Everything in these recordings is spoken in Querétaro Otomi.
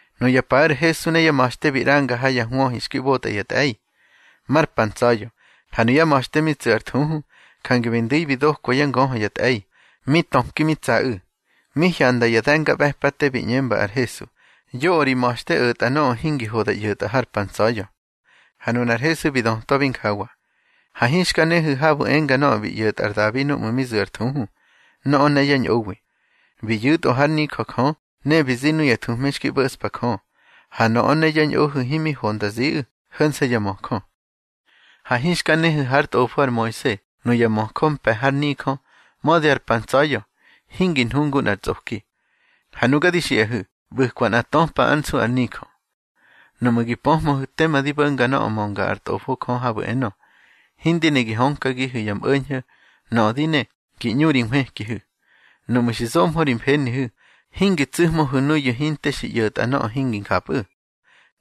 Nuya paꞌu̱ ar Hesu ne yá ma̱xte bi ꞌranga ha ya hwöhi xki ꞌbotꞌa ya tꞌe̱i. Mar pa ntsa̱ya̱, ha nuyá ma̱xte mi tsu̱ ar thuhu, jange bi ndu̱i bi dokwa yá ngöhö ya tꞌe̱i, mi töki mi tsaꞌu̱. Mi hyanda ya de̱ngaꞌbe̱pate, bi ꞌñemba ar Hesu: —Yoꞌö ri ma̱xte o̱tꞌa nöꞌö hingi ho da ꞌyo̱tꞌa har pa ntsa̱ya̱. Ha nunar Hesu bi dötwabi njawa: —Ha hinxka nehu̱ habu̱ enga nöꞌö bi ꞌyo̱tꞌa ar Dabi núꞌmu̱ mi zu̱ ar thuhu, nöꞌö ne yá ñꞌowi. Bi yu̱tꞌö hár nijö Jö, ne bi zi nuya thuhme xki ꞌbo̱ꞌspa Jö, ha nöꞌö ne yá ñꞌohu̱ himi ho nda ziꞌu̱, ho̱nse̱ ya möjö. Ha hinxka nehu̱ hár tꞌofo ar Moise, nuya möjö mpe̱ har nijö, mödi ar pa ntsa̱ya̱, hingi nhu ngu nꞌar tsꞌoki. Ha nuga di xiꞌahu̱, ꞌbu̱kwa nꞌa töpa ár nsu ar nijö. Nuꞌmu̱ gi pöhmöhu̱ tema di bo̱nga nöꞌö mönga ár Tꞌofo Jö habu̱ enö: Hindi ne gi hönkagihu̱ ya mꞌo̱ñho̱. Nöꞌö di ne, gi ꞌñu ri nhwëkihu̱. Nuꞌmu̱ xi zohmö ri mfenihu̱, hingi tsu̱hmöhu̱ nuyu̱ hinte xi ꞌyo̱tꞌa nöꞌö hingi njapꞌu̱.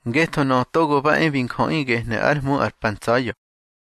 Ngetho Nöꞌö Togo ba e bi Njöꞌi gehnu̱ ár Hmu ar pa ntsa̱ya̱.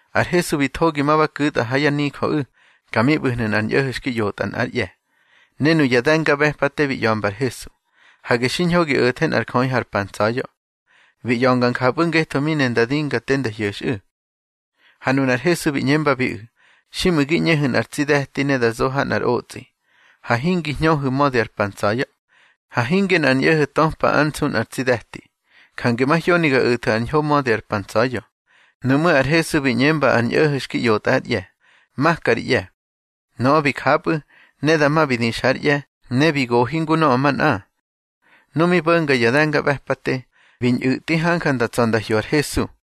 Ar Hesu bi thogi, ma ba ku̱tꞌa ha yá nijöꞌu̱. Ka mi ꞌbu̱hnu̱ nꞌar ñꞌo̱ho̱ xki ꞌyotꞌa nꞌár ꞌye̱. Ne nuya de̱ngaꞌbe̱pate bi ꞌya̱mba ar Hesu: —Hage xiñho gi o̱the nꞌar jöꞌi har pa ntsa̱ya̱. Bi ꞌya̱nga njapꞌu̱ ngetho mi ne nda dinga te nda hyo̱xꞌu̱. Ha nunar Hesu bi ꞌñembabiꞌu̱: —Xiꞌmu̱ gi ꞌñehu̱ nꞌar tsi de̱ti ne da zo ha nꞌar otsꞌi, ha hingi hñöhu̱ mödi ar pa ntsa̱ya̱. Ha hinge nꞌar ñꞌo̱ho̱ töpa ár nsu nꞌar tsi de̱ti. Jange mahyoni ga o̱thu̱ ar ñho mödi ar pa ntsa̱ya̱. Nuꞌmú̱ ar Hesu bi ꞌñemba ar ñꞌo̱ho̱ xki ꞌyotꞌa ár ꞌye̱: —Maka ri ꞌye̱. Nöꞌö bi japꞌu̱, ne dama bi dixa ár ꞌye̱, ne bi gohi ngu nöꞌö manꞌa. Nu mi bo̱nga ya de̱ngaꞌbe̱pate, bi ñꞌu̱tꞌi hanja nda tsa̱ nda hyo ar Hesu.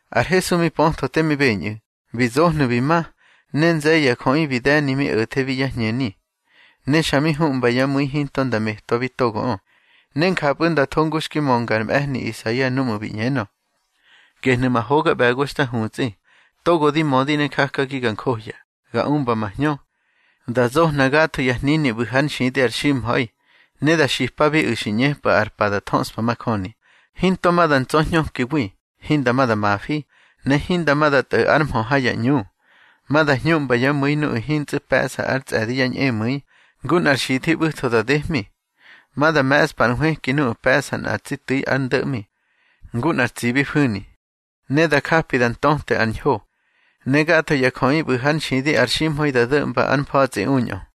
Ar Hesu mi pötho te mi beñꞌu̱, bi zohnu̱ bi ma, ne nze̱ye̱ ya jöꞌi bi de̱ni mi o̱thebi yá hñeni. Ne xa mi huꞌmba yá mu̱i hinto nda metwabi togoꞌö. Ne njapꞌu̱ nda tho ngu xki mönga ar mꞌe̱hni Isaia núꞌmu̱ bi ꞌñenö: Gehnu̱ ma hoga ꞌbe̱go xta hutsꞌi, togo di mödi ne jakagi ga njohya. Ga umba ma Hñö, da zohna gatho ya hnini ꞌbu̱ hár nxidi ar ximha̱i, ne da xipabiꞌu̱ xi ꞌñepꞌu̱ ar pa da thöꞌspa majöni. Hinto ma da ntsa̱hñökiwi, hinda ma da mafi, ne hinda ma da tꞌo̱ ár mhö ha ya ꞌñu. Ma da hñuꞌmba yá mu̱i nuꞌu̱ hintsꞌu̱ pe̱ꞌsa ár tsꞌe̱di yá ñꞌemu̱i, ngu nꞌar xithi ꞌbu̱tho da dehmi. Ma da me̱ꞌspa ar nhwëki nuꞌu̱ pe̱ꞌsa nꞌa tsi tu̱i ar ndo̱ꞌmi, ngu nꞌar tsibi fu̱ni. Ne da japi da ntöte ar ñho. Ne gatho ya jöꞌi ꞌbu̱ hár nxidi ar ximha̱i da do̱ꞌmba ár mfa̱tsꞌi uñꞌö.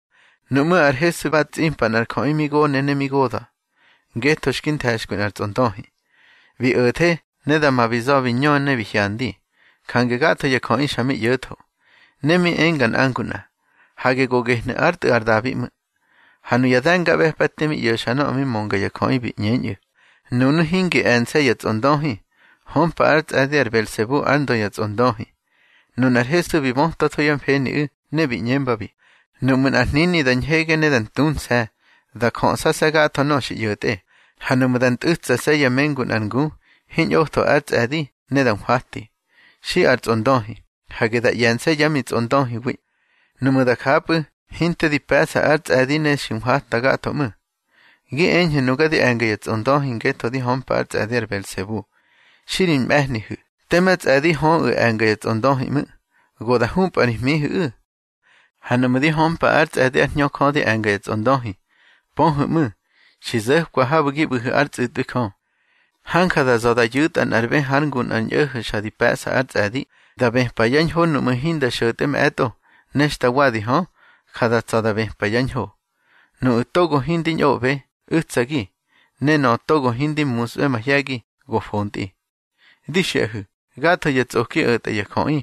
Nuꞌmú̱ ar Hesu ba tsꞌimpa nꞌar jöꞌi mi gone ne mi goda̱, ngetho xki nthe̱xkwi nꞌar tsꞌondöhi. Bi o̱the, ne dama bi za̱ bi ñö ne bi hyandi. Jange gatho ya jöꞌi xa mi ꞌyo̱tho, ne mi enga nꞌa ngu nꞌa: —Hage go gehnu̱ ár Tꞌu̱ ar Dabi ꞌmu̱. Ha nuya de̱ngaꞌbe̱pate mi ꞌyo̱xa nöꞌö mi mönga ya jöꞌi, bi ꞌñeñꞌu̱: —Nunu̱ hingi e̱nse̱ ya tsꞌondöhi, hömpa ár tsꞌe̱di ar Belsebu ár ndö ya tsꞌondöhi. Nunar Hesu bi bötwatho yá mfeniꞌu̱, ne bi ꞌñembabi: —Nuꞌmu̱ nꞌar hnini da ñhege ne da ntunse̱, da jöꞌsase̱ gatho nöꞌö xi ꞌyo̱tꞌe. Ha nuꞌmu̱ da ntꞌu̱tsase̱ yá mengu nꞌar ngu, hiñꞌotho ár tsꞌe̱di, ne da nhwati. Xi ar tsꞌondöhi, hage da ꞌye̱nse̱ yá mitsꞌondöhiwi. Nuꞌmu̱ da japꞌu̱, hinte di pe̱ꞌsa ár tsꞌe̱di ne xi nhwata gatho ꞌmu̱. Gi eñhu̱ nuga di e̱nga ya tsꞌondöhi ngetho di hömpa ár tsꞌe̱di ar Belsebu. Xi ri mꞌe̱hnihu̱, tema tsꞌe̱di höꞌu̱ e̱nga ya tsꞌondöhi ꞌmu̱. Go da hñupꞌa ri hmihu̱ꞌu̱. Ha nuꞌmu̱ di hömpa ár tsꞌe̱di ár Hñö Jö di e̱nga ya tsꞌondöhi, pöhu̱ ꞌmu̱, xi zo̱kwa habu̱ gi ꞌbu̱hu̱ ár tsꞌu̱tꞌwi Jö. Hanja da za̱ da yu̱tꞌa nꞌar bë hár ngu nꞌar ñꞌo̱ho̱ xa di pe̱ꞌsa ár tsꞌe̱di, da bëpa yá ñho nuꞌmu̱ hinda xo̱tꞌe mꞌe̱tꞌo. Ne xta wadi hö, ja da tsa̱ da bëpa yá ñho. Nuꞌu̱ togo hindi ñꞌoꞌbe, u̱tsagi, ne nöꞌö togo hindi musꞌbe mahye̱gi, go fontꞌi. Di xiꞌahu̱, gatho ya tsꞌoki o̱tꞌa ya jöꞌi,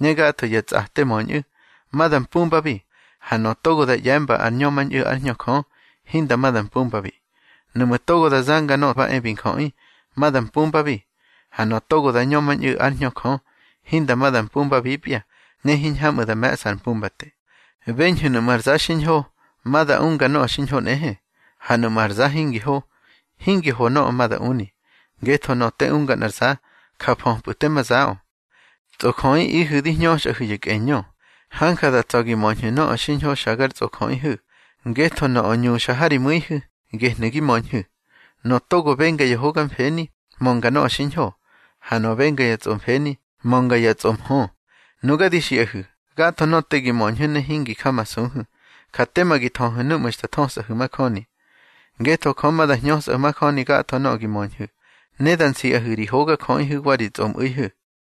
ne gatho ya tsꞌate möñꞌu̱, ma da mpumbabi. Ha nöꞌö togo da ꞌye̱mba ar ñömañꞌu̱ ár Hñö Jö, hinda ma da mpumbabi. Nuꞌmu̱ togo da zanga Nöꞌö ba e bi Njöꞌi, ma da mpumbabi. Ha nöꞌö togo da ñömañꞌu̱ ár Hñö Jö, hinda ma da mpumbabipya, ne hiñhamꞌu̱ da me̱ꞌsa ar pumbate. Beñhu̱ nuꞌmu̱ ar za xiñho, ma da unga nöꞌö xiñho nꞌehe. Ha nuꞌmu̱ ar za hingi ho, hingi ho nöꞌö ma da uni, ngetho nöꞌö te unga nꞌar za, ja föpꞌu̱ tema zaꞌö. Tsꞌojöꞌihu̱ di hñöxꞌahu̱ ya kꞌeñö. Hanja da tsa̱ gi möñhu̱ nöꞌö xiñho xa gar tsꞌojöꞌihu̱. Ngetho nöꞌö ñuxa ha ri mu̱ihu̱, gehnu̱ gi möñhu̱. Nöꞌö togo benga ya hoga mfeni, mönga nöꞌö xiñho, ha nöꞌö benga ya tsꞌomfeni, mönga ya tsꞌomhö. Nuga di xiꞌahu̱, gatho nöꞌö te gi möñhu̱ ne hingi jamasuhu̱, ja tema gi thöhu̱ núꞌmu̱ xta thösꞌahu̱ majöni. Ngetho Jö ma da hñösꞌahu̱ majöni gatho nöꞌö gi möñhu̱, ne da nsiꞌahu̱ ri hogajöꞌihu̱ wa ri tsꞌomꞌu̱ihu̱.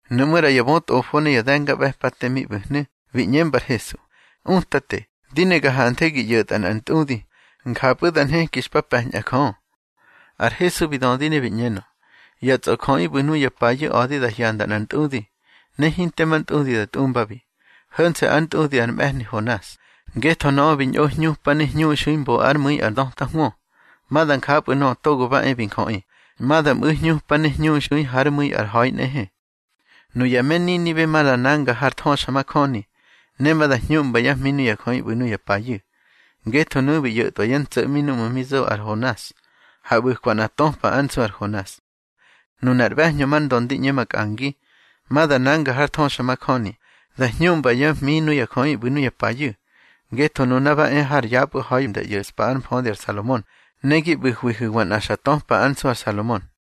Nuꞌmú̱ ꞌra ya bötꞌofo ne ya de̱ngaꞌbe̱pate mi ꞌbu̱hnu̱, bi ꞌñemba ar Hesu: —Utate, di ne ga hanthe gi ꞌyo̱tꞌa nꞌar ntꞌudi, njapꞌu̱ da nheki xpa pe̱ñꞌa Jö. Ar Hesu bi dödi ne bi ꞌñenö: —Ya tsꞌojöꞌi ꞌbu̱ nuya payu̱ a̱di da hyanda nꞌar ntꞌudi, ne hinte ma ntꞌudi da tꞌumbabi, ho̱nse̱ ár ntꞌudi ar mꞌe̱hni Honas. Ngetho nöꞌö bi ñꞌo hñupa ne hñuxui mbo ár mu̱i ar döta hwö. Ma da njapꞌu̱ Nöꞌö Togo ba e bi Njöꞌi, ma da mꞌu̱ hñupa ne hñuxui hár mu̱i ar ha̱i nꞌehe. Nuya me Ninibe ma da nanga har thöxamajöni, ne ma da hñuꞌmba yá hmi nuya jöꞌi ꞌbu̱ nuya payu̱. Ngetho nuꞌu̱ bi ꞌyo̱tꞌwa yá ntso̱ꞌmi núꞌmu̱ mi zo ar Honas, ha ꞌbu̱kwa nꞌa töpa ár nsu ar Honas. Nunar ꞌbe̱hñö mar ndö ndi ꞌñe makꞌangi, ma da nanga har thöxamajöni, da hñuꞌmba yá hmi nuya jöꞌi ꞌbu̱ nuya payu̱. Ngetho nuna ba e har yapꞌu̱ ha̱i nda ꞌyo̱ꞌspa ár mfödi ar Salomon, ne gi ꞌbu̱hwihu̱wa nꞌa xa töpa ár nsu ar Salomon.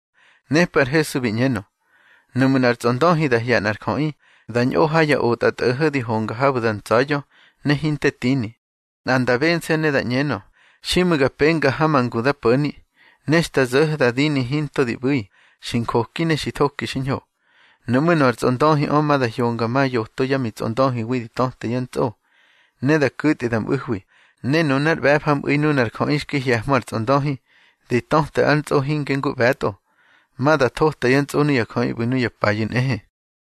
Nepꞌu̱ ar Hesu bi ꞌñenö: —Nuꞌmu̱ nꞌar tsꞌondöhi da hye̱ nꞌar jöꞌi, da ñꞌo ha ya otꞌatꞌo̱ho̱ di honga habu̱ da ntsa̱ya̱, ne hinte tini, nꞌa nda bense̱ ne da ꞌñenö: Xiꞌmu̱ ga penga ha ma ngu da po̱ni. Ne xta zo̱ho̱ da dini hinto di ꞌbu̱i, xi njoki ne xi thoki xiñho. Nuꞌmú̱ nöꞌö ar tsꞌondöhiꞌö ma da hyonga ma yoto yá mitsꞌondöhiwi di töte yá ntsꞌo, ne da ku̱tꞌi da mꞌu̱hwi. Ne nunár ꞌbe̱fa mꞌu̱i nunar jöꞌi xki hye̱hmö ar tsꞌondöhi, di töte ár ntsꞌo hinge ngu ꞌbe̱tꞌo. Ma da thota yá ntsꞌo nuya jöꞌi ꞌbu̱ nuya payu̱ nꞌehe.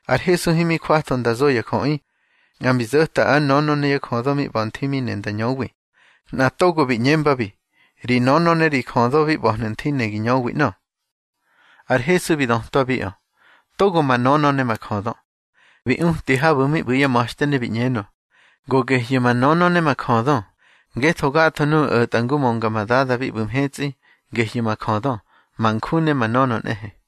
Ar Hesu himi jwatho nda zo ya jöꞌi, nꞌa mbi zo̱ta ár nönö ne yá jödö mi ꞌba̱ nthi mi ne nda ñöwi. Nꞌa togo bi ꞌñembabi: —Ri nönö ne ri jödö bi ꞌba̱hnu̱ nthi, ne gi ñöwi ꞌnö. Ar Hesu bi dötwabiꞌö: —Togo ma nönö ne ma jödö. Bi uti habu̱ mi ꞌbu̱ yá ma̱xte, ne bi ꞌñenö: —Go gehyu̱ ma nönö ne ma jödö. Ngetho gatho nuꞌu̱ o̱tꞌa ngu mönga ma Dada bi ꞌbu̱ mhetsꞌi, gehyu̱ ma jödö, ma nju ne ma nönö nꞌehe.